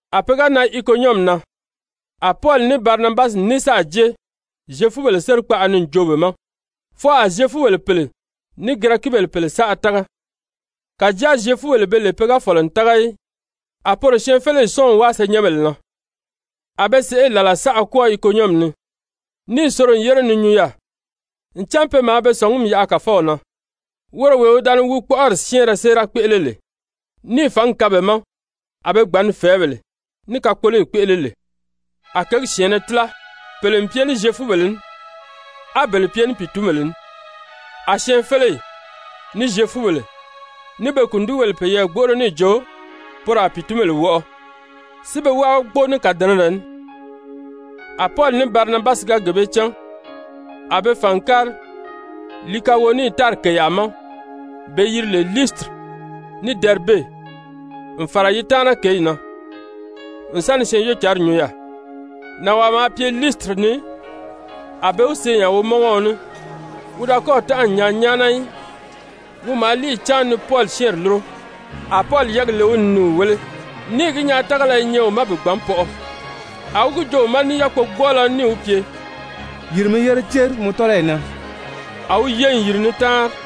A pe ga nan Ikonyɔmi na, a Pɔli ní Barinabasi ní sáà jée Zyefubèle sérikpaʔa ni n joo be ma, fwɔɔ a Zyefubèle pèle ní Girɛkibèle pèle saʔa tága. Kàjáa Zyefubèle be lè pe ga fɔ̀lɔ n tága í, a poro syɛɛnfeleyi sɔ́ɔn n wáa senyɛnbèle na. A be sèʔê làla saʔa kwɔ́ɔ Ikonyɔmi ni, níì soro n yére ni nyuu yaà, ncan pe maa be sɔ̀ngumi yaʔa Kàfɔw na, woro wee wi da ni wi kpɔ́ʔɔri syɛ́ɛnrɛ séera kpéʔele lè, níì fǎngi kaan be ma a be gbàn ni fɛ̀ɛ́bèle ní kakpoloyi kpéʔele lè. A kěgi syɛ̀ɛnnɛ tíla, pèle n pye ní Zyefubèle ní, á bele pye ní pìitunbèle ní. A syɛɛnfeleyi, ní Zyefubèle, ní be kùndigibèle peyɛɛ gbóʔoro níì jo poro a pìitunbèle wɔʔɔ, si be wábagi kpóo ní kàdɛnɛrɛ ní. A Pɔli ní Barinabasi ga gee bee cán, a be fàn n kári Likawonii tári kèyaa ma be yiri lè Liisitiri ní Dɛribe, n fàra yi taana kěyi na n sa ni Syɛɛnjóocǎnri nyuu yaà. Nànwaa maa pye Liisitiri ni, a be wi see nya womɔngɔɔ ní, wi da kɔ́ɔ̀ tánʔa n nyaa nyáana í. Wi maa líiyi cáan ni Pɔli syɛ́ɛnri lúro, a Pɔli yɛ́ɛgi le wi ni ni wi wéle níì gi nyaa tágala i nyɛ wi ma bi gbǎn pɔʔɔ, a wi gi joo wi ma ní yákpogbɔɔlɔ ní níì wi pye: «Yìri mi yére céri mɔ tɔ́lɔyi na.» A wi ye n yìri ni táanri.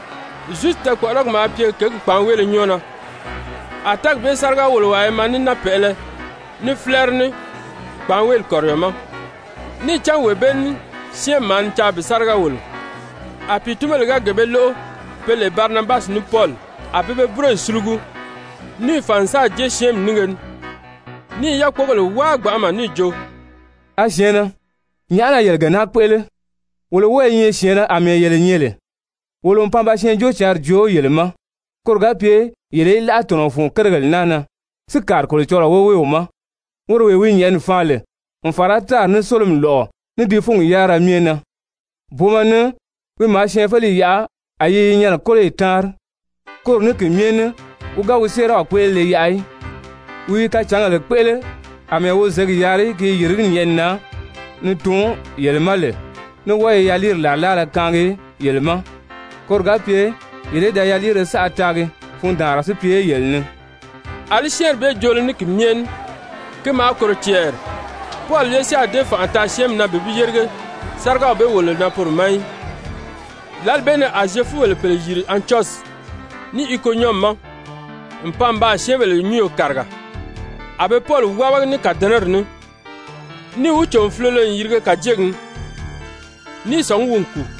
Zusi tɛɛkpɔʔɔrɔgi maa pye kěgi kpàánweele nyɔ́ɔ na, a tɛ́ɛgi bee sáriga-wòlowaa i maa ní náapɛʔɛlɛ, ní fílɛɛri ní kpàánweeli kɔ̀riyɔ ma, níì cán wee bee ní syɛ́ɛnmi maa ni caa bi sáriga wòlo. A pìitunbèle ga gee bee lóʔo pe lè Barinabasi ní Pɔli, a pe be búroyi sulugu, níì fàn n sáà jée syɛ́ɛnmi nínge ni, níì yákpogèle wáa gbanʔama níì jo: «A syɛ̀ɛnnɛ, nyàʔá na yele gee naa kpéʔele? Wolo wɔ́ɔ i nyɛ syɛ̀ɛnnɛ àmɛɛ yele nyɛ lè, wolo n pan ba Syɛɛnjóocǎnri joo yele ma koro ga pye yele í láʔa tɔ̀nɔ fun kérigèle naa na, si kàri Kolocɔlɔɔ woweew ma, woro wee wi nyɛ̀ʔɛni faan lè, n fàra tári, ní sólomi lɔ̀ʔɔ, ní di fúnyi yárira myɛ na. Booma ni wi maa syɛɛnfeleyi yaʔa a yi i yi nyɛnɛ kóloyi táanri. Koro ní ki myɛ ní wi ga wi séeraw kpéʔelele yaʔa í, wi i kacǎngèle kpéʔele, àmɛɛ wi zěgi yaari ki i yìrigí nyɛ̀ʔɛni na ni tuun yele ma lè, ní wɔ́ɔ i yaliiri làrilaala kaangi yele ma, koro ga pye yele í da yaliire saʔa taagi, fundaanra si pye yele ni.» Alí syɛ́ɛnri bee joolo ní ki myɛ ní, ki maa kòro cɛɛri Pɔli ye si a dée fanʔa taa syɛ́ɛnmi na bi bi yérige sárigaw bee wòlolo na poro ma í. Lǎli bee ni a Zyefubèle pèle yìri Antyɔsyi, ní Ikonyɔmi ma n pan n baa syɛ́ɛnbèle nyúnyo kàriga, a be Pɔli wábagi ní kàdɛnɛri ní, níì wi cò n fulolo n yirige kàjegi ni, ní i sɔ̀ngí wi n kùu.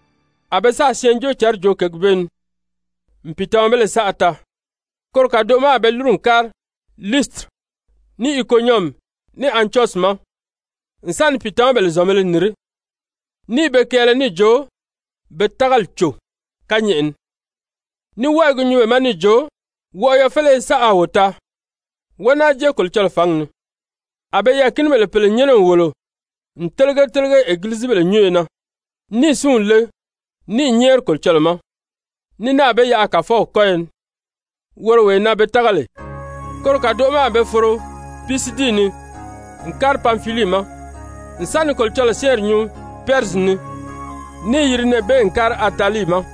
A be sáà Syɛɛnjóocǎnri joo kěgi bee ni n pìitamabéle saʔa taa, koro kàdoʔo ma a be lúru n kári Liisitiri, ní Ikonyɔmi, ní Antyɔsyi ma n sa ni pìitamabèle zɔ̀nbēle nìrí, ní i be kɛɛlɛ níì jo be tágali cò kányɛʔɛ ni, ní wɔ́ɔ i gi nyuu be ma níì jo: «Wɔʔɔyɔ féleye saʔa a wo taa, wó náa jée Kolocɔlɔɔ fǎngi ni.» A be yɛɛ̀kinibèle pèle nyɛ́nɛ n wòlo n télege télege egilizibèle nyúnyo na, níì súnw le níì nyɛ́ɛri Kolocɔlɔɔ ma, ní náà be yaʔa Kàfɔw kɔ́yɔ ni, woro wee na be tága lè. Koro kàdoʔo ma a be foro Pisidii ni n kári Panfilii ma n sa ni Kolocɔlɔɔ syɛ́ɛnri nyuu Pɛrizyi ni, níì yiri nɛɛ bee n kári Atalii ma.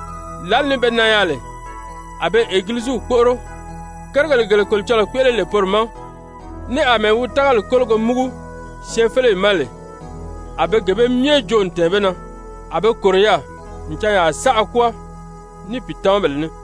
Lǎli ni be nan yaà lè, a be Egiliziw kpóʔoro, kérigèle gele Kolocɔlɔɔ kpéʔele lè poro ma, ní àmɛɛ wi tágali kólogo múgu syɛɛnfeleyi ma lè, a be gee bee myɛ joo n tɛ̀ɛn be na. A be kòro yaà n canya saʔa kwɔ́ɔ ní pìitamabèle ní.